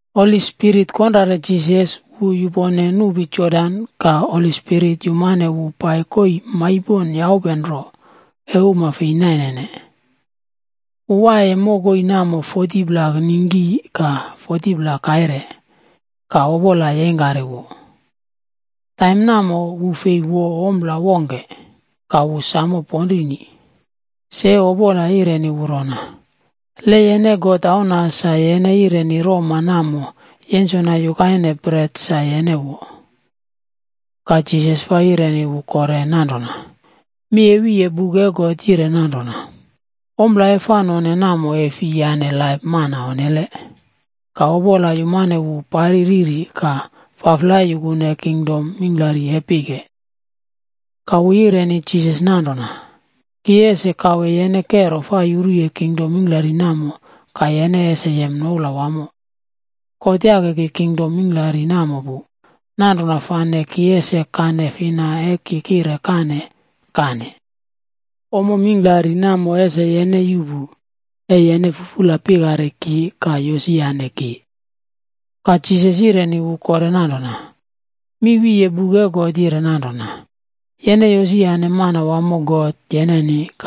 Holi Spirit konrare Jisas, wu yupone nupi Jodan, ka Holi Spirit yumane wu pai koii maipon yaupe nro e uma fei nainene. Wu waiye mokoi namo 40pla ningki ka 40pla kaire, ka Opola yeingkari wu. Taim namo, wu fei wo ompla wongke, ka wu sam ponrini wamo. Se, Opola yireni wu rona, “Le yene God Auna, sa yene yireni roma namo yensona yukaine bret sa yene wo.” Ka Jisas fa yireni wu kore nanrona, “Mi e wiye buk e God yire nanrona, ‘Ompla e fa none namo e fi yaꞌne laip mana. Ka Opola yumane wu pari riri ka faflai yukune kingdom mingklari e pike. Ka wu yireni Jisas nanrona, “Ki ese kawe yene kero fa yuruye kingdom mingklari namo, ka yene ese yem noula wamo. God yake ki kingdom mingklari namo pu, nanrona fane ki ese kane fina e ki kire kane, kane. Ommo mingklari namo ese yene yuꞌpu, e yene fufula pikari ki ka yosiyane ki.” Ka Jisas yireni wu kore nanrona, “Mi wiye buk e God yire nanrona, ‘Yene yosiyane Manawamo, God yeneni,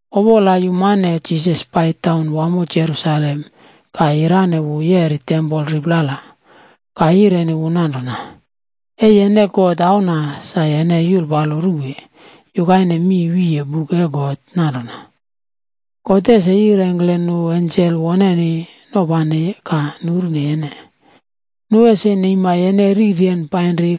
Opola yumane Jisas pai taun wamo Jerusalem ka yirane wu yeri tempol riplala, ka yireni wu nanrona, “E yene God Auna, sa yene yulpalo ruwe. Yukaine mi wiye buk e God nanrona, ‘God ese yirengkle nu ensel woneni nopane ka nurune yene. Nu ese neima yene riryen painri,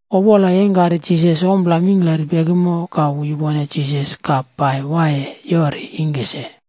Opola yeingkari Jisas ompla mingklari pekimo, ka wu yupone Jisas ka pai waiye yori ingke se.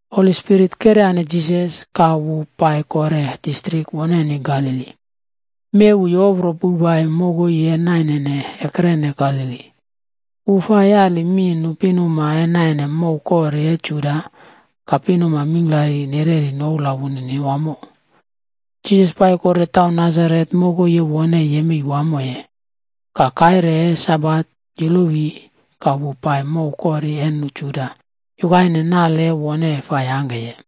Holi Spirit keryane Jisas, ka wu pai kore distrik woneni Galili. Mi e wu yopri pouwpai mokoi e naine ekrene Galili. Wu fa yali mi nu pinuma e naine mow kori e Juda, ka pinuma mingklari nereri noula wunini wamo. Jisas pai kore taun Nasaret, mokoi e wone yemei wamoye. Ka kaire e Sabate yolowi ka wu pai mow kori e nu Juda yukaine nale e wone fa yangkeye.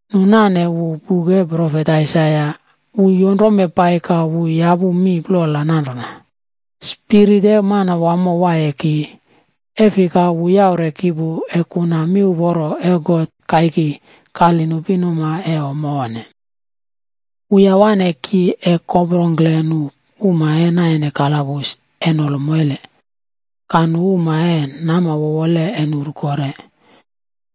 Nu nane wu buk e profet Aisaia. Wu yonrome pai ka wu yapu mi plola nanrona: “Spirit e Manawamo waiye ki, e fika, wu yaure ki pu, e kuna miuporo e God kaiki kali nu pinuma e ommo onne. Wu yawane ki, e koprongkle nu uma e naine kalabus e nolo moile, ka nu uma e nama wowole e nuru kore.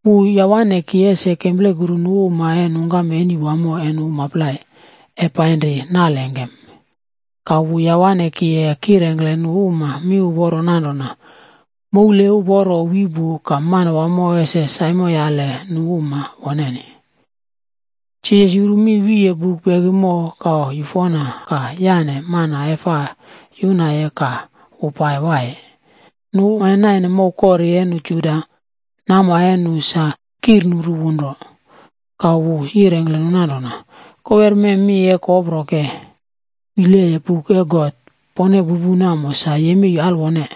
Wu yawane ki ese kemplekuru nu uma e nungkam eni wamo e nu uma plai, e painri nal engkem. Ka wu yawane ki e kirengkle nu uma miuporo nanrona moul uporo wi pu ka Manawamo ese saimoyale nu uma woneni.”g Jisas yuru mi wiye buk pekimo, ka yufona ka yaꞌne mana e fa yunaye, ka wu pai waiye.h Nu uma e naine mow kori e nu Juda, nama e nu sa kirnurune wu nro. Ka wu yirengkle nu nanrona, “Kowerme, mi e ki koproke wileye buk e God, pone pupu namo sa yemei alwone.”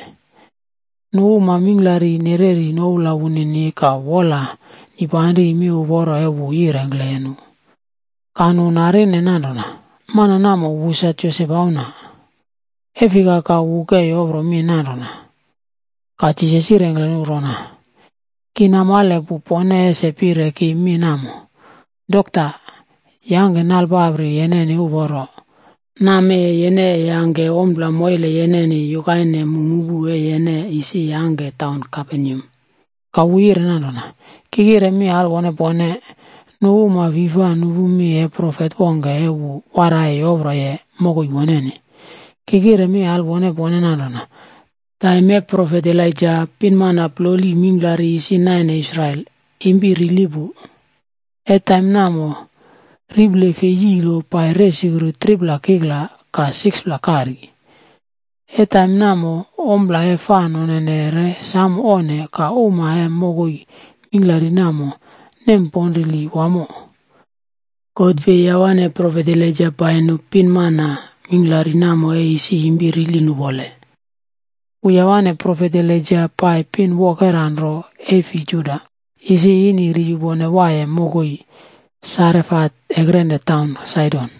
Nu uma mingklari nereri noula wunini ka wola nipanri miuporo e wu yirengkle nu. Ka nu narine nanrona, “Mana namo, wu sa Josep auna. E fika ka wu ke yopro mi nanrona?” Ka Jisas yirengkle nu rona, “Ki namale pu, pone ese pire ki mi namo: ‘Dokta, yangke nalpapri yeneni uporo. Nammee yene e yangke ompla moile yeneni yukaine mu mupu e yene isi yangkeye taun Kaperneam.’” Ka wu yire nanrona, “Ki kire mi alwone pone, nu uma fi fa nupu mi e profet wongke e wu waraiye yoproye mokoi woneni. Ki kire mi alwone pone nanrona, taim e profet Elaija, pinmana ploli mingklari isi naine Israel, impi rili pu. E taim namo, riple fei yilo pai resukru 3pla kikla ka 6pla kari. E taim namo ompla e fa nonene re sam onne ka uma e mokoi mingklari namo nemponrili wamo. God fei yawane profet Elaija pai nu pinmana mingklari namo e isi impi rili nupole. Wu yawane profet Elaija pai pin wokera nro e fi Juda, isi ini ri yupone waiye mokoi Sarefat ekrene taun Saidon.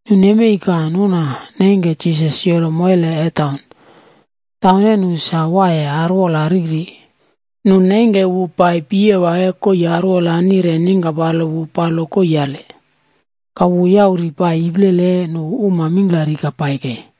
Nu nemei ka nuna neingke Jisas yolo moile e taun. Taun e nu sa waiye arwola riri, nu neingke wu pai piyewa e koii arwola nire ningkapalo wu palo koiiale. Ka wu yauri pai iplele e nu uma mingklari ka pai kei.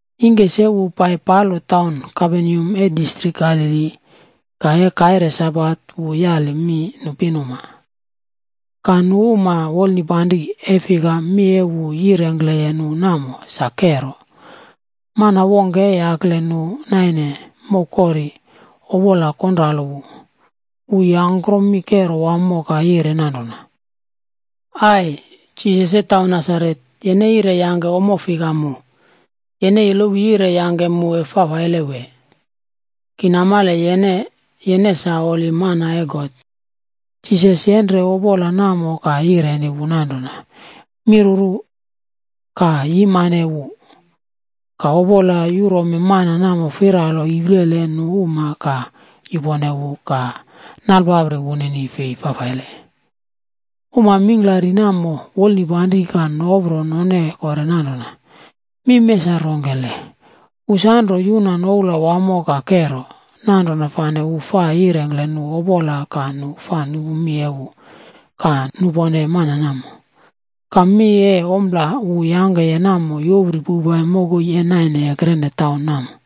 Ingke se wu pai palo taun Kaperneam e distrik Galili, ka e kaire Sabat wu yali mi nu pinuma. Ka nu wolnipanri, e fika, mi e wu yirengkle nu namo sa kero. Mana wongke e yakle nu naine mow kori, opola konralo wu. Wu yangkrom mi kero wamo, ka yire nanrona, “Ai! Jisas e taun Nasaret, yene yire yangke ommo fika mu? Yene yolowi yire yangke mu e fafaile, wee? Ki namale yene, yene sa Holi Mana e God.” Jisas yenre opola namo ka yireni wu nanrona, “Miruru! Ka yupone wu!” Ka opola yurome mana namo firalo iplele e nu uma ka yupone wu ka nalpapri wunini fei fafaile. Uma mingklari namo wolnipanri ka nopro none kore nanrona, “Mi mee sa rongkele? Wu sanro yuna noula wamo ka kero, nanrona fane wu fa yirengkle nu opola fafaile ka nu fa nupu mi e wu ka nupone mana.” Ka mi e ompla wu yangkeye namo yopri poupai mokoi e naine ekrene taun namo.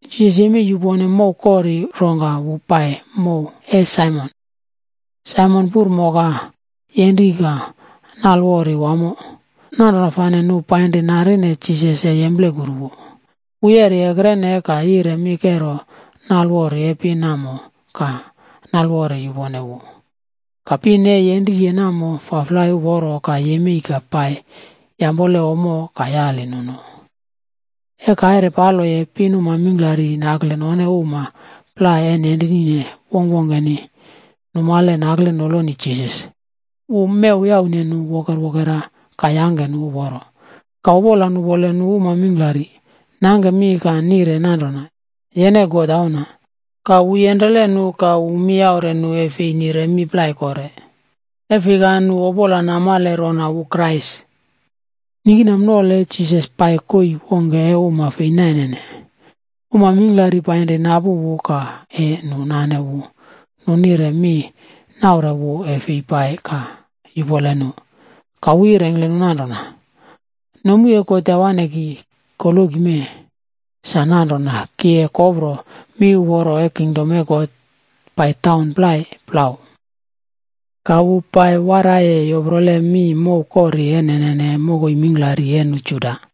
Jisas yemei yupone mow kori, rongka wu pai mow e Saimon. Saimon puri moka yenri ka nalewori wamo. Nanrona fane nu painri narine Jisas e yemplekuru wu. Wu yeri ekrene ka yire mi kero nalewori e pin namo, ka nalewori yupone wu. Ka pin e yenriye namo faflai uporo ka yemei ka pai yampole ommo ka yali nu no. E kaire paloye, pinuma mingklari nakle none uma plai e nenrini wongkwongkeni, numale nakle noloni Jisas. Wu mew yaune nu wokerwokera ka yangke nu uporo. Ka opola nupole nu uma mingklari, nangke mi ka nire nanrona, “Yene God Auna.” Ka wu yenrele nu ka mi yaure nu e fei nire mi plai kore. E fika nu opola namo namale rona wu Krais. Ningkinama nole Jisas pai koii wongke e uma fei nainene. Uma mingklari painri napu wu ka e nu nane wu, nu nire mi naure wu e fei pai ka yupole nu. Ka wu yirengkle nu nanrona, “Nomu e God yawane ki koloki mee, sa nanrona ki e kopro miuporo e kingdom e God pai taun plai plau.” Ka wu pai waraiye yoprole mi mow kori e nene mokoi mingklari e nu Juda.